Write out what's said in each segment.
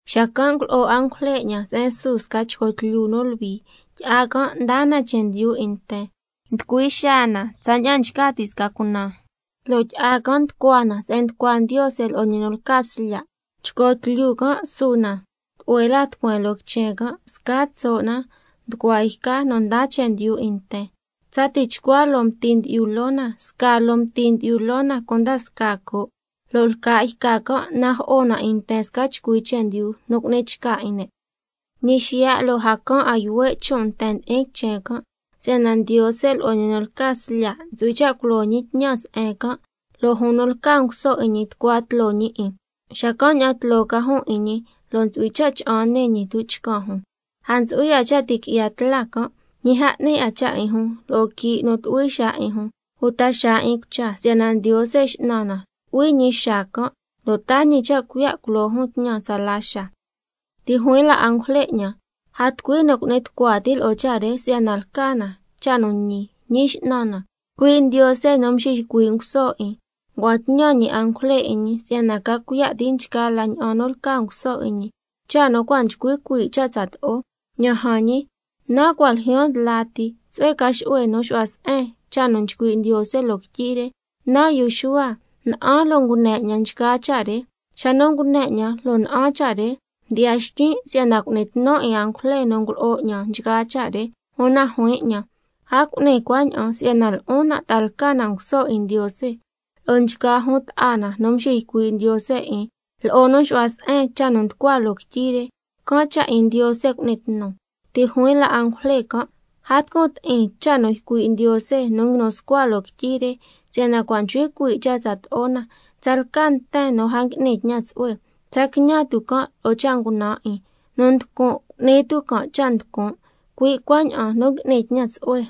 Xacan' ngulo'o angujle 'ñan se'en su sca chco tlyu nu luhui, tyi'a can' ndaa na chendyu 'in nten, nducui xaa na tsaña'an nchca ti' sca cunan, lo' tyi'a can' nducua na se'en nducua Ndiose lo'o ñi nu lca Slya'. Chco tlyu can' su na tlu'hue la tucueen loo quichen can', scaa tso' na nducua yca nu ndaa chendyu 'in nten, tsa tichcua loo mti ndyi'yu loo na, scaa loo mti ndyi'yu loo na cunda scaa coo', lo' lca' yca can' najo'o na 'in nten sca chcui chendyu nu cu'ni chca 'in ne'. Ñi xiya' lo' a caan 'a yuhue' chon' nten ndi'in quichen can', si'yana Ndiose lo'o ñi nu lca Slya' ntsu'hui cha' culo ñi tñan se'en can', lo' jun nu lca nguso 'in ñi tucua tloo ñi 'in, xacan' ña'an tloo ca jun 'in ñi, lo' ntsu'hui cha' cha'an nii ñi tuchcan jun. A ntsu'hui 'a cha' ti' qui'ya tla can', ñi a 'ni 'a cha' 'in jun lo'o quii' nu tu'hui xaa 'in jun, uta xaa 'in cucha, si'yana Ndiose X'nan na tu'hui ñi xaa can', lo' taa ñi cha' cuiya' culo jun tñan tsala xaa. Ti' juin la angujle 'ñan: A tucui nu cu'ni tucua ti' lo'o cha' re si'yana lca na cha' nu ñi. Ñi X'nan na, cui' Ndiose nu nxiycui' nguso 'in, ngua'an tñan ñi angujle 'in ñi si'yana ca cuiya' ti' nchgaa la ña'an nu lca nguso 'in ñi, cha' nu cua' nchcui cuii' cha' tsato'o. ¡Ña'an jan ñi, nan' cua' ljyaan ndla ti! Tsu'hue ca xu'hue nu xu'hua se'en cha' nu nchcui' Ndiose loo quityi re. Nan' yu Xuhua, na'an lo' ngune 'ñan nchgaa cha' re. Xa nu ngune 'ñan lo' na'an cha' re, mdyi'ya xtyin' si'yana cu'ni tnu 'in angujle nu ngulo'o 'ñan nchgaa cha' re, una juin 'ñan: A cu'ni cuaña'an si'yana lo'on nan' ta'a lca na nguso 'in Ndiose, lo'o nchgaa jun ta'a na nu nxiycui' Ndiose 'in, lo'o nu nxu'hua se'en cha' nu nducua loo quityi re. Can' cha' 'in Ndiose cu'ni tnu. Ti' juin la angujle can': A tucun ti'in cha' nu ycui' Ndiose nu nguinu scua loo quityi re, si'yana cua' nchcui cuii' cha' tsato'o na. Tsalca nten nu a ngui'ni tñan tsu'hue, tsa quiñan tu' can' lo'o cha' ngunan' 'in. Nu nducun', cu'ni tu' can' cha' nducun'. Cui' cuaña'an nu ngui'ni tñan tsu'hue,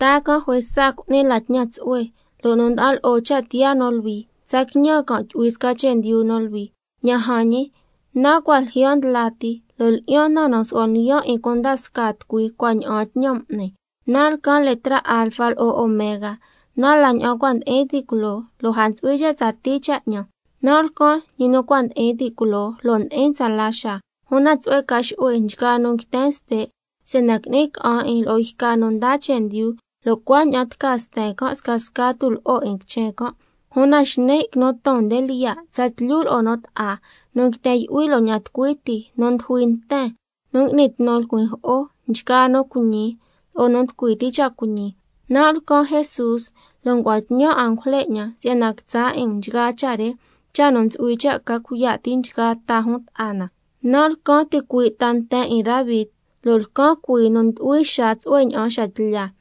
taa can' juesa cu'ni la tñan tsu'hue, lo' nu nda'an lo'o cha' tiyaa nu luhui, tsa quiñan can' tyu'hui sca chendyu nu luhui. Ña'an jan ñi, nan' cua' ljyaan ndla ti, lo' lyi'yan na nu su'huan lyiyan' 'in cunda scaa tucui cua' ña'aan tñan m'ni. Nan' lcan letra Alfa lo'o Omega, nan' la ña'an cua' ndi'in ti' culoo lo' a ntsu'hui cha' tsatii cha' 'ñan, nan' lcan ñi nu cua' ndi'in ti' culoo, lo' ndi'in tsala xaa. Una tsu'hue ca xu'hue nchgaa nu nguiten ste', si'yana qui'ni ca'an 'in lo'o yca nu ndaa chendyu, lo' cuaña'an tca sten can' scasca tulo'o 'in quichen can'. Una xni' quinu ton nde lyiya', tsatlyu lo'o nu bta'a, nu nguiten yu'hui lo'o ña'an tucui ti, nu ndujui nten, nu ngui'ni tnu lcuin jo'o, nchgaa nu cuiñi lo'o nu nducui ti' cha' cuiñi. Nan' lcan Jesús, lo' ngua'an tñan angujle 'ñan si'yana quitsa' 'in um nchgaa cha' re, cha' nu ntsu'hui cha' ca cuiya' ti' nchgaa ta jun ta'a na. Nan' lcan ticui' ta nten 'in Davi, lo' lcan cuii nu ndu'hui xaa tsu'hue ña'an xa tlya.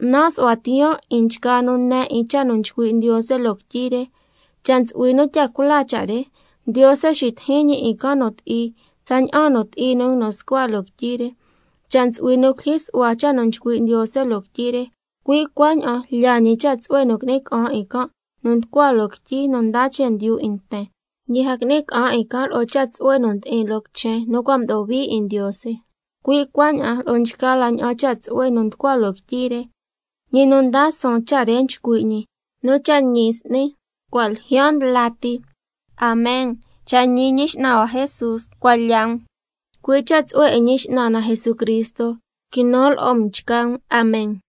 Nan' nsu'hua tiyaan 'in nchgaa nu ne 'in cha' nu nchcui' Ndiose loo quityi re: Cha' ntsu'hui nu tya cula cha' re, Ndiose xitijin ñi 'in can' nu ti'i tsaña'an nu ti'i nu nguinu scua loo quityi re. Cha' ntsu'hui nu culyijyi su'hua cha' nu nchcui' Ndiose loo quityi re, cui' cuaña'an lyaa ñi cha' tsu'hue nu qui'ni ca'an 'in can' nu nducua loo quityi nu ndaa chendyu 'in nten, ñi a qui'ni ca'an 'in can' lo'o cha' tsu'hue nu ndi'in loo quichen nu cua' mdo'o hui 'in Ndiose, cui' cuaña'an lo'o nchgaa la ña'an cha' tsu'hue nu nducua loo quityi re. Ñi nu ndaa suun cha' re nchcui' ñi: Nu cha' ñi s'ni, cua' ljyaan ndla ti. Amen, cha' ñi Ñi X'nan hua Jesús, cuan lya um. Cui' cha' tsu'hue 'in Ñi X'nan na Jesucristo quinu lo'o um nchgaa um. Amen.